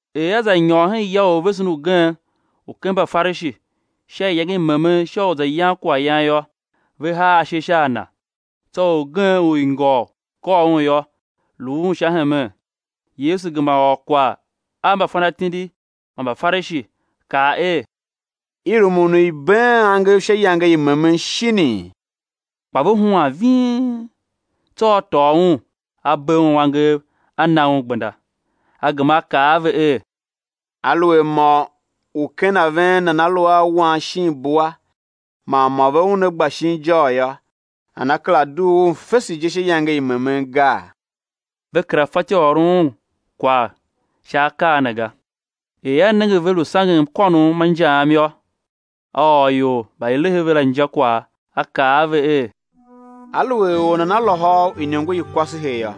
Er A za nyôr hen ya u orvesen ugen u ken Mbafarishi sha iyange i memen sha u za yan kwaghyan yô, ve haa ashe sha a Na. Tsô orgen u ingôgh i kôr un yô, lu Un sha hemen. Yesu gema ôr kwagh a mbafanatindi man Mbafarishi, kaa er: I rumun u i̱ been angev sha iyange i memen shinii? Kpa ve huan ving. Tsô A tôô un, A bee un angev, A na un gbenda. A gema A kaa a ve er: Aluer mô u ken a ven nana lu a wan shin bua man mô ve una gba shin ijôr yô, nana kera dugh un fese je sha iyange i memen gaa? Ve kera fatyô u ôron Un kwagh sha akaa ne ga. Er A nenge ve lu sangen mkônom ma injaam yô, A ôr ior mba i lehe ve la injakwagh, A kaa a ve er: Aluer or nana lôhô u iniongo i kwasehe yô,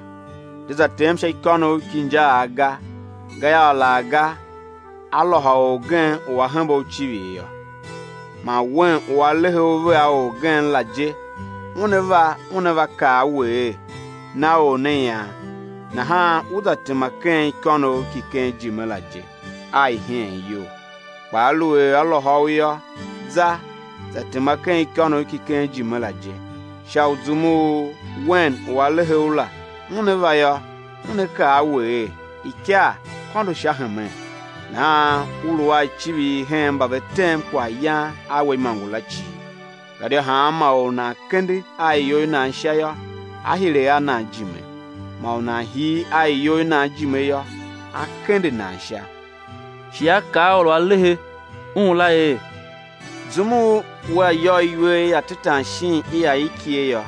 de za tem sha ikônough ki injaagh ga, gayô, alaghga á lôhô orgen u a hembe u icivir yô, man wen u a lehe u vea orgen la je, una va una va kaa a we er: Na or ne ian; nahan ú za tema ken ikônough ki ken ijime la je a iheen iyol. Kpa aluer á lôhô u yô, za za tema ken ikônough ki ken ijime la je, sha u zum u wen u a lehe u la, una va yô, una kaa a we er: Ikar, kôndo sha hemen! Nahan ú lu a icivir hen mba ve tem kwaghyan a we imôngo la cii. Gadia hanma or u nan kende a iyol i nan sha yô, á hire a nan ijime; man u nan hir a iyol i nan ijime yô, á kende nan sha. Shi A kaa a or u a lehe Un la er: Zum u wea yôr iwer i atetan shin i aikighe yô,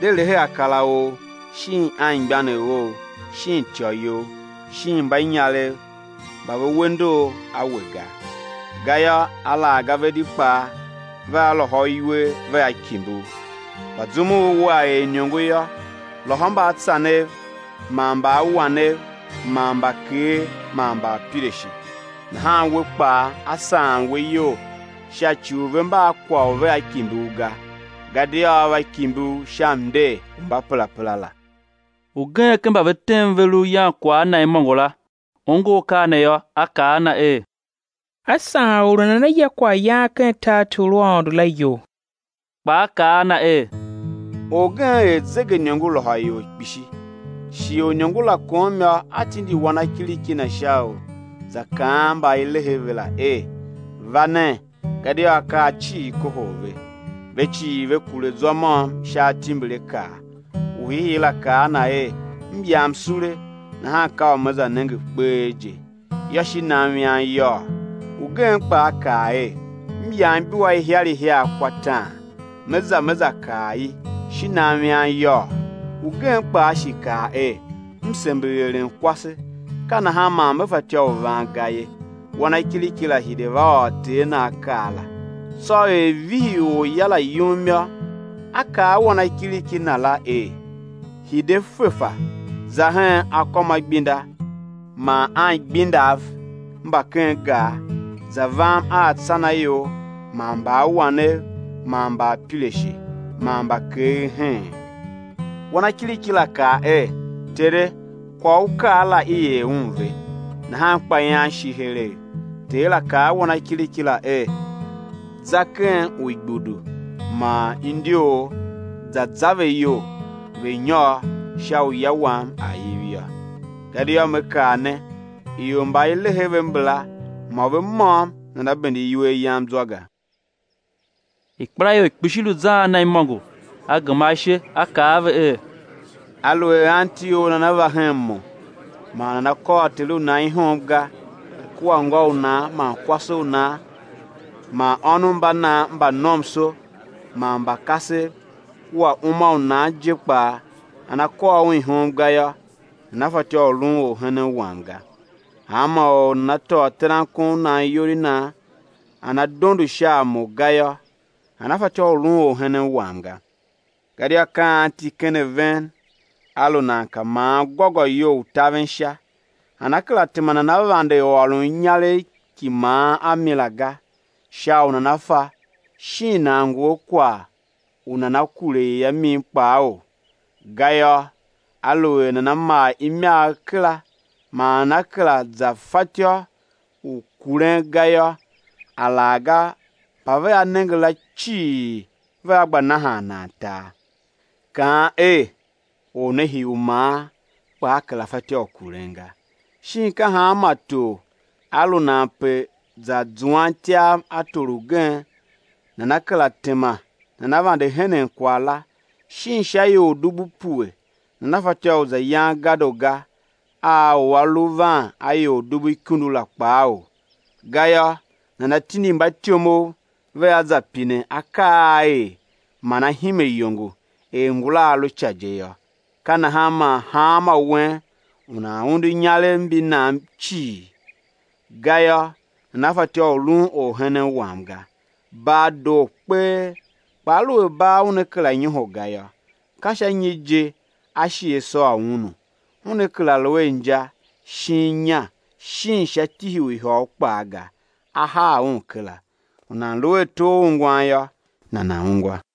de lehe akar a ou, shin anmgbianev ou, shin ityô you, shin mbanyarev mba ve we ndor a we ga, gayô alaghga ve di kpaa vea lôhô u iwer, vea kimbi u. Kpa zum u wea er iniongo yô, lôhô mbaatsanev man mbaawanev man mbakeer man mbaapirashe. Nahan we kpaa á saan we iyol sha ci u ve mba a kwagh u vea kimbi u ga; gadia á va kimbi u sha mnder u mbaperapera la. Ugen ken mba ve tem ve lu yan kwagh a Na imôngo la, ongo akaa ne yô, a kaa a Na er: Á saan or u nana ya kwaghyan ken tartor u Aôndo la iyol. Kpa A kaa a Na er: Orgen er zegeiniongo, lôhô ior kpishi. Shighe u iniongo la kom yô, a tindi wanakiriki na sha u za kaan mba i lehe ve la er: Va nen, gadia akaa cii kohol ve. Ve cii ve kure zwa môm sha atimbirakaa. U hiihii la kaa a na er: M yam sule, nahan ka u me za nenge kpee je; yô, shi nam ian yôô! Ugen kpaa kaa er: M yam ibua ihiar ihiar kwa taan, me za me za kar i; shi nam ian yôô. Ugen kpaa shi kaa er: M sember eren kwase, ka nahan man me fatyô u van ga ye. Wanakiriki la hire va ôr ter na akaa la. Tsô er vihi orya la yum yô, a kaa a wanakiriki na la er: Hide fefa, za hen akômaigbinda man anigbendav mba ken gar, za vam a atsanaior man mbaawanev man mbaapirashe man mbakeer heen. Wanakiriki la kaa er: Tere, kwagh u u kaa la i er un ve, nahan kpa ian shi heregh. Ter la kaa a wanakiriki la er: Za ken uigbudu man indyoor za za ve iyol, ve̱ nyôr, sha u ya wam a̱ iv yô. Gadia me kaa ne, ior mba i lehe ve mbala, mô ve môm nana bende iwer yam zwa ga. Ikpelaior kpishi lu zan a Na imôngo; A gema ashe A kaa a ve er: Aluer anti or nana va hen Mo, man nana kôr ter u nan ihom ga, kua ngô u nan, man kwase u nan man ônov mba nan mba nomso man mba kasev, kua uma u nan je kpaa nana kôr un ihom ga yô, nana fatyô u lun orhenen Wam ga. Hanma or u nana tôô terankon u nan iyol i nan, nana dondo sha a Mo ga yô, nana fatyô u lun orhenen Wam ga. Gadia ka anti ken a ven a lu nan ka maan gôgôyou u taven sha, nana kera tema nana vande ôron inyaregh ki maan a mi la ga, sha u nana fa shin nan ngu a kwagh u nana kure i a min kpaou? Gayô, aluer nana maa imagh kera, man nana kera za fatyô u kuren ga yô, alaghga mba vea nenge la cii vea gba nahan nan tar, kaan er: Or ne hii u maan kpa a kera fatyô u kuren ga. Shin ka hanma tor a lu nan pe za zuan ityav a tor ugen, nana kera tema nana vande henen kwagh la, shin sha ior dubu pue nana fatyô u za yan gadoga a u a lu van a ior dubu ikundu la kpaou? Gayô, nana tindi mbatyomov, vea za pine akaa a á er man á hime iyongo er ngula a lu ica je yô. Ka nahan man hanmô wen u nan undu inyarev mbi nan cii ga yô, nana fatyô u lun orhenen Wam ga. Bar doo kpee, kpaa aluer bar una kera nyoho ga yô, ka sha nyi je á shi á sôr unu? Una kera lu a inja shin inya shin sha tihi u ihôgh kpaa ga; á haa un kera. U nan lu a ato a ungwan yô, nana̱ ungwa.